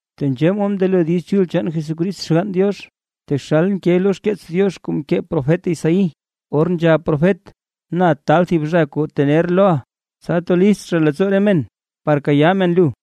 Tenzhee mod mndelo Diiz Chul chaan Jesucrist Xgann Diox. Taxal nke lo xkeets Diox kuu mkee profet Isaí, or nzhab profet: Na taal thib zha kuu tener loʼa, tsa to list zha leettsoo re men, par kayaa men lu.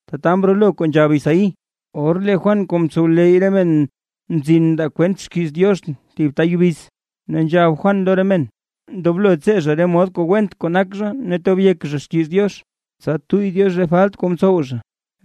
Tata mrolo kuu nzhab Isaí, or lee Juan kuu mtsowleyy re men mzin mndaa kwent xkiiz Diox thib ta yubiz, ne nzhab Juan lo re men, ndoblo tsee zha re mod kuu went kuu nak zha ne tob yek zha xkiiz Diox, tsa tuyy Diox re falt kuu mtsow zha.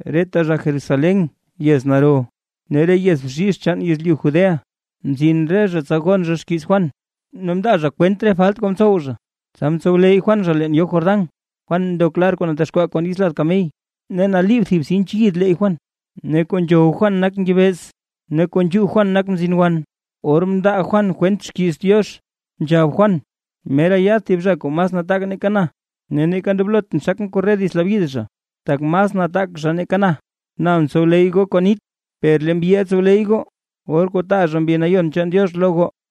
Reta zha Jerusalén yez naro, ne re yez bzhizh chaan yezlyu Judea, mzin re zha tsa gon zha xkiiz Juan. Ne mndaa zha kwent re falt kuu mtsow zha, tsa mtsowleyy Juan zha leen yoo Jordán. Juan mdok lar kuu natexkwaa kon yits lad kamey, ne naliib thib sinch yid leeyy Juan, ne kuu nzhow Juan nak ngebeez ne kuu nzhuu Juan nak mzin wan. Or mndaa Juan kwent xkiiz Diox, nzhab Juan: ―Mera yaad thib zha kuu mas nataak nake na, ne neeka ndoblotʼn xakʼn korre dits labyid zha, tak mas nataak zha nake na. Na mtsowleyy goo kon nit, per lee mbyiʼa tsowleyy goo, or kuu taa zha Mbi Nayon chaan Diox lo goo.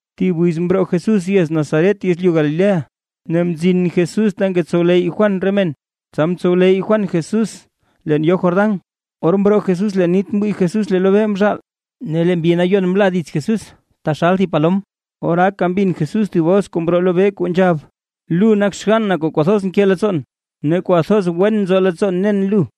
Thib wiz mroo Jesús yez Nazaret yezlyu Galilea, ne mzin Jesús ta ngetsowleyy Juan re men, tsa mtsowleyy Juan Jesús leen yoo Jordán. Or mroo Jesús leen nit mwii Jesús lee lobee mzhaal, ne lee Mbi Nayon mla dits Jesús taxal thib palom. Oraaka mbin Jesús thib bos kuu mroo lobee kuu nzhab: ―Lu nak xgann na kuu kwathoz nke leettsoon, ne kwathoz wen nzo leettsoon nen lu.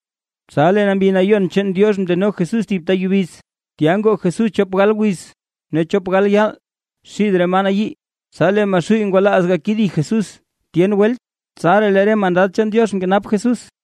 Tsa lee Mbi Nayon chaan Diox mndeno Jesús thib ta yubiz. Tya ngoo Jesús chop gal wiz, ne chop gal yaal xid re maa nayii. Tsa lee Maxuuy ngwalaaz gakedi Jesús tyen welt, tsaraa lee re mandad chaan Diox mkenap Jesús.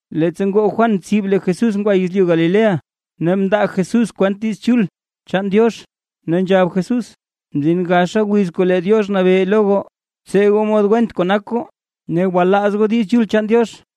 Leettsa ngoo Juan tsib lee Jesús ngwa yezlyu Galilea, ne mndaa Jesús kwent Diiz Chul chaan Diox. Ne nzhab Jesús: ―Mzin gaxa wiz kuu lee Diox nabee lo goo. Btsee goo mod went kuu nak goo, ne gwalaaz goo Diiz Chul chaan Diox.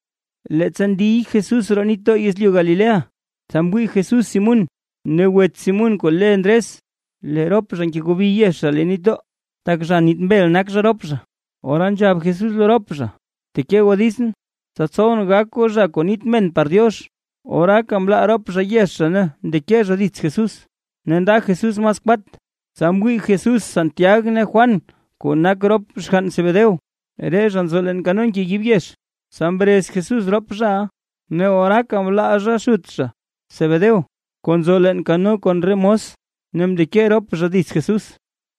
Leettsa ndiy Jesús roo nitdoo yezlyu Galilea, tsa mwii Jesús Simún ne wets Simún kuu le Ndres, lee rop zha ngegobi yex zha leen nitdoo, tak zha niit mbel nak zha rop zha. Ora nzhab Jesús lo rop zha: ―Bteke goo ditsʼn, tsa tsowʼn gak goo zha kuu niit men par Diox. Oraaka mlaa rop zha yex zha ne mndeke zha dits Jesús. Ne nda Jesús mas kwat, tsa mwii Jesús Santiag ne Juan kuu nak rop xgann Zebedeo, re zha nzo leen kano ngeyib yex. Tsa mrez Jesús rop zhaʼa, ne oraaka mlaa zha xut zha Zebedeo kuu nzo leen kano kon re mos, ne mndeke rop zha dits Jesús.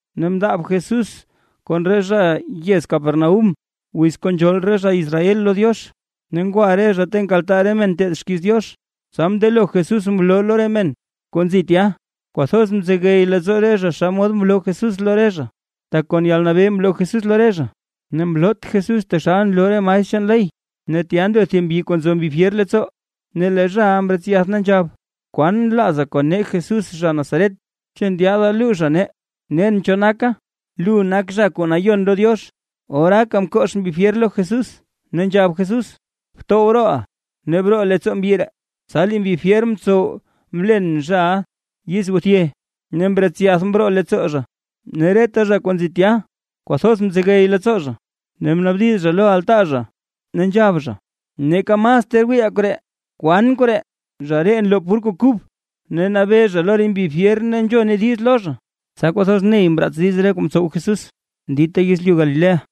Ne mndaab Jesús kon re zha yez Capernaúm wiz kuu nzhool re zha Israel lo Diox, ne ngwa re zha ta nkaltaa re men nteed xkiiz Diox, tsa mndelo Jesús mloo lo re men kuu nzi tya. Kwathoz mzegey leettsoo re zha naa xomod mloo Jesús lo re zha, tak kon yalnabee mloo Jesús lo re zha, ne mloot Jesús taxal nloo re maestr chaan ley. Ne tya ndo thib mbyi kuu nzo mbi fyer leettsoo, ne lee zhaʼa mretsyath, ne nzhab: ―¿Kwan nlaaza kon nee Jesús zha Nazaret? ¿Chu ndyaada luuzha nee? Nen cho naka. Lu nak Zha kuu Nayon lo Diox. Oraaka mkox mbi fyer lo Jesús, ne nzhab Jesús: ―¡Btow rooʼa, ne broo leettsoo mbyi ree! Tsa lee mbi fyer mtsow mlen zhaʼa yizguthye ne mretsyath mroo leettsoo zha. Ne reta zha kuu nzi tya kwathoz mzegey leettsoo zha, ne mnaabdiz zha lo altaa zha, ne nzhab zha: ―¡Neeka mas ter wiiʼaa koree! ¿Kwan koree? Zha ree nloo pur kuu kub, ne nabee zha lo re mbi fyer ne nzhone diiz lo zha. Tsa kwathoz ney mraats diiz re kuu mtsow Jesús dita yezlyu Galilea.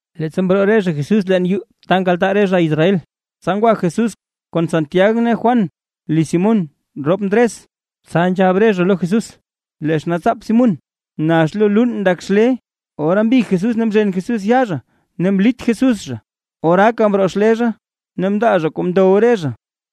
Leettsa mroo re zha Jesús leen yuu ta nkaltaa re zha Israel, tsa ngwa Jesús kon Santiag ne Juan liz Simún rop Ndres. Tsa nzhab re zha lo Jesús lee xnaatsaap Simún, nax lo luun ndak xlee. Ora mbig Jesús ne mzhen Jesús yaa zha ne mlit Jesús zha, oraaka mroo xlee zha, ne mndaa zha kuu mdow re zha.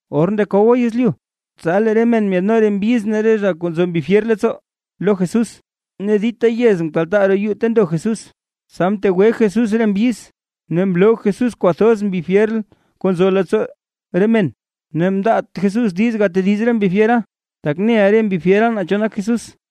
Or ndekowa yezlyu, tsa lee re men myaadno re mbyiz ne re zha kuu nzo mbi fyer leettsoo lo Jesús. Ne dita yez mkaltaa roo yuu ta ndo Jesús. Tsa mtegwe Jesús re mbyiz, ne mloo Jesús kwathoz re mbi fyer kuu nzo leettsoo re men. Ne mndaat Jesús diiz gatediz re mbi fyera, tak neʼa re mbi fyera naa cho nak Jesús.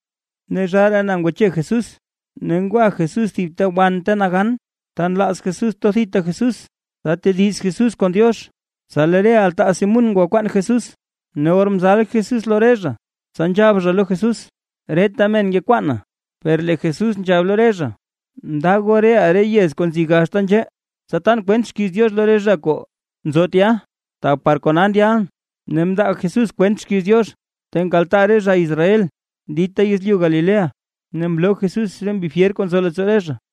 Ne zhaaraa na ngwache Jesús, ne ngwa Jesús thib ta wan ta nagan, ta nlaaz Jesús to thita Jesús, tsa tediz Jesús kon Diox. Tsa lee re altaa Simún ngwakwaan Jesús. Ne or mzal Jesús lo re zha, tsa nzhab zha lo Jesús: ―¡Reta men ngekwaana! Per lee Jesús nzhab lo re zha: ―Nda goo reʼaa re yez kuu nzi gaxta nzhee, tsa tan kwent xkiiz Diox lo re zha kuu nzo tya, tak par kona ndyalʼn. Ne mndaa Jesús kwent xkiiz Diox ta nkaltaa re zha Israel dita yezlyu Galilea, ne mloo Jesús re mbi fyer kuu nzo leettsoo re zha.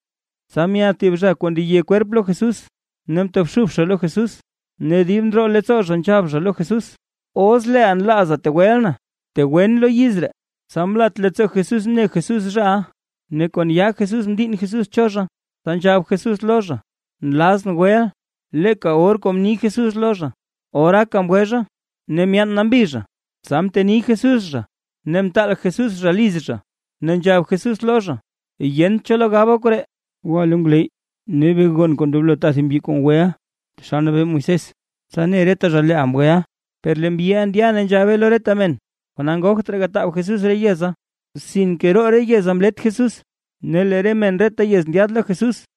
Tsa myaad thib zha kuu ndeye kwerp lo Jesús, ne mtobxub zha lo Jesús, ne dib ndroo leettsoo zha nzhab zha lo Jesús: ―Os leeʼa nlaaza tegweʼa na, btegwen lo yiz ree. Tsa mlat leettsoo Jesús mne Jesús zhaʼa, ne kon yaa Jesús mdiinn Jesús cho zha. Tsa nzhab Jesús lo zha: ―Nlazʼn weʼa. Leeka or kuu mni Jesús lo zha, oraaka mgwe zha, ne myaan nambi zha. Tsa mteni Jesús zha, ne mtaal Jesús zha liz zha, ne nzhab Jesús lo zha: ―Yent cho lo gaba koree, gwa lo ngwleyy ne be gon kuu ndoblo taa thib mbyi kuu mgweʼa taxal mnabee Moisés, tsa ne reta zha leeʼa mgweʼa. Per lee mbyiʼa ndya ne nzhabe lo reta men, kona ngogt raa gataab Jesús re yeza, sinke roo re yeza mlet Jesús, ne lee re men reta yez ndyaad lo Jesús.